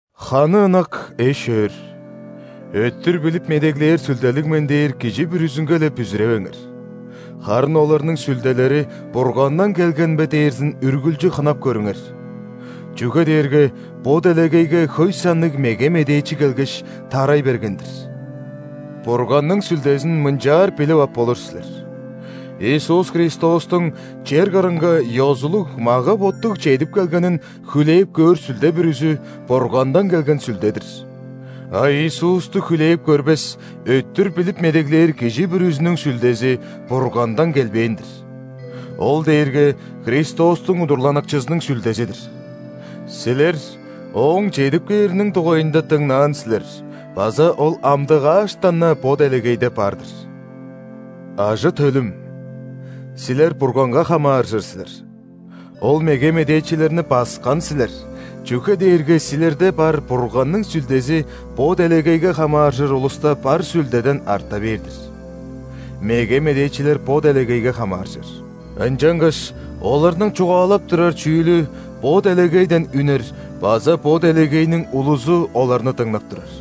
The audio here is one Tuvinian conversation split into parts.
Ханы ынак эш-өөр, «Өттүр билип медеглээр сүлделиг мен» дээр кижи бүрүзүнге-ле бүзүревеңер, харын оларның сүлделери Бургандан келген бе дээрзин үргүлчү хынап көрүңер. Чүге дээрге бо делегейге хөй санныг меге медээчи келгеш, тарай берген-дир. Бурганның Сүлдезин мынчаар билип ап болур силер: Иисус Христостуң чер кырынга ёзулуг мага-боттуг чедип келгенин хүлээп көөр сүлде бүрүзү Бургандан келген сүлде-дир. А Иисусту хүлээп көрбес өттүр билип медеглээр кижи бүрүзүнүң сүлдези Бургандан келбээн-дир. Ол дээрге Христостуң удурланыкчызының сүлдези-дир. Силер ооң чедип кээриниң дугайында дыңнаан силер база ол амдыгааштан-на бо делегейде бар-дыр. Ажы-төлүм! Силер Бурганга хамааржыр силер, ол меге медээчилерни баскан силер, чүге дээрге силерде бар Бурганның Сүлдези бо делегейге хамааржыр улуста бар сүлдеден арта бээр-дир. Меге медээчилер бо делегейге хамааржыр. Ынчангаш оларның чугаалап турар чүүлү бо делегейден үнер база бо делегейниң улузу оларны дыңнап турар.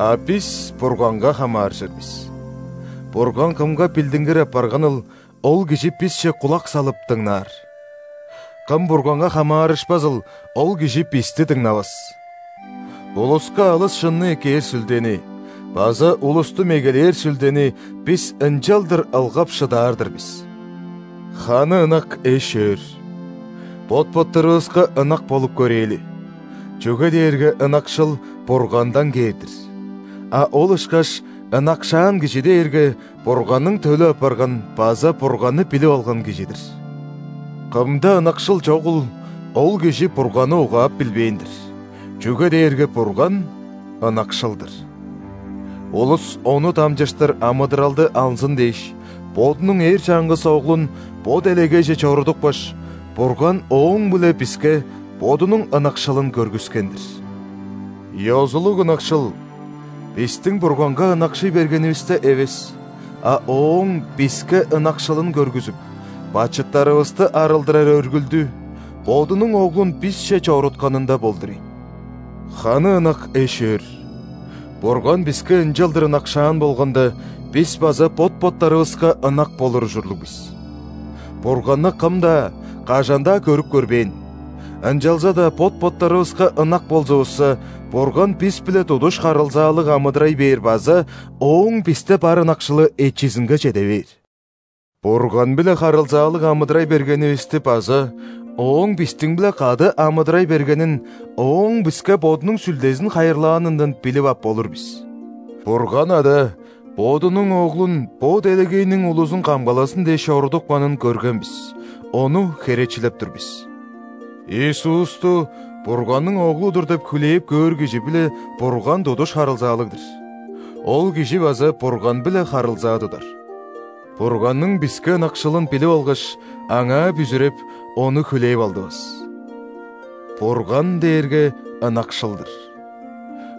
А бис Бурганга хамааржыр бис. Бурган кымга билдингир апарганыл, ол кижи бисче кулак салып, дыңнаар. Кым Бурганга хамаарышпазыл, ол кижи бисти дыңнавас. Улуска алыс шынны эккээр Сүлдени база улусту мегелээр сүлдени бис ынчалдыр ылгап шыдаар-дыр бис. Ханы ынак эш-өөр! Бот-боттарывыска ынак болуп көрээли, чүге дээрге ынакшыл Бургандан кээр-дир, а ол ышкаш ынакшаан кижи дээрге Бурганның төлү апарган база Бурганны билип алган кижи-дир. Кымда ынакшыл чогул, ол кижи Бурганны угаап билбээн-дир, чүге дээрге Бурган – ынакшыл-дыр. Улус Ону дамчыштыр амыдыралды алзын дээш, Бодунуң эр чаңгыс Оглун бо делегейже чорудупкаш, Бурган ооң-биле биске Бодунуң ынакшылын көргүскен-дир. Ёзулуг ынакшыл бистиң Бурганга ынакшый бергенивисте эвес, а Ооң биске ынакшылын көргүзүп, бачыттарывысты арылдырар өргүлдү – Бодунуң Оглун бисче чорутканында болдур ийин. Ханы ынак эш-өөр, Бурган биске ынчалдыр ынакшаан болганда, бис база бот-боттарывыска ынак болур ужурлуг бис. Бурганны кым-даа, кажан-даа көрүп көрбээн, ынчалза-даа бот-боттарывыска ынак болзувусса, Бурган бис-биле тудуш харылзаалыг амыдырай бээр база Ооң бисте бар ынакшылы эчизинге чеде бээр. Бурган-биле харылзаалыг амыдырай бергенивисти база Ооң бистиң-биле кады амыдырай бергенин Ооң биске Бодунуң Сүлдезин хайырлаанындан билип ап болур бис. Бурган Ада Бодунуң Оглун бо делегейниң улузун камгалазын дээш чорудупканын көрген бис, ону херечилеп тур бис. Иисусту Бурганның Оглу-дур деп хүлээп көөр кижи-биле Бурган тудуш харылзаалыг-дыр, ол кижи база Бурган-биле харылзаа тудар. Бурганның биске ынакшылын билип алгаш, аңаа бүзүреп, ону хүлээп алдывыс. Бурган дээрге ынакшыл-дыр,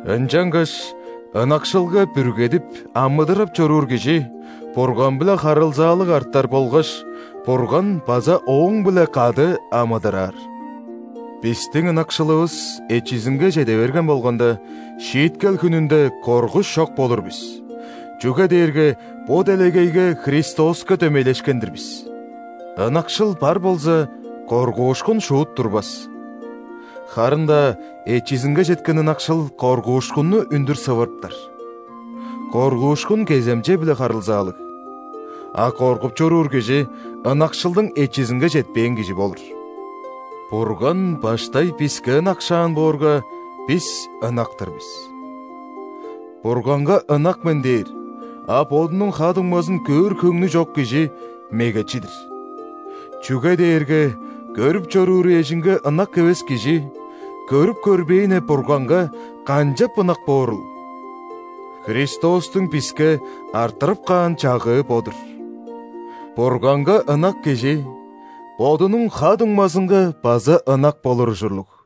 ынчангаш ынакшылга бүргедип амыдырап чоруур кижи Бурган-биле харылзаалыг артар болгаш, Бурган база ооң-биле кады амыдыраар. Бистиң ынакшылывыс эчизинге чеде берген болганда, шииткел хүнүнде коргуш чок болур бис, чүге дээрге бо делегейге Христоска дөмейлешкен-дир бис. Ынакшыл бар болза, коргуушкун шуут турбас. Харын-даа эчизинге четкен ынакшыл коргуушкунну үндүр сывырыптар. Коргуушкун кеземче-биле харылзаалыг, а коргуп чоруур кижи ынакшылдың эчизинге четпээн кижи болур. Бурган баштай биске ынакшаан боорга, бис ынак-тыр бис. «Бурганга ынак мен» – дээр, а бодунуң ха-дуңмазын көөр хөңнү чок кижи – мегечи-дир, чүге дээрге көрүп чорууру эжинге ынак эвес кижи көрүп көрбээни Бурганга канчап ынак боорул? Христостуң биске арттырып каан чагыы бо-дур: «Бурганга ынак кижи бодунуң ха-дуңмазынга база ынак болур ужурлуг».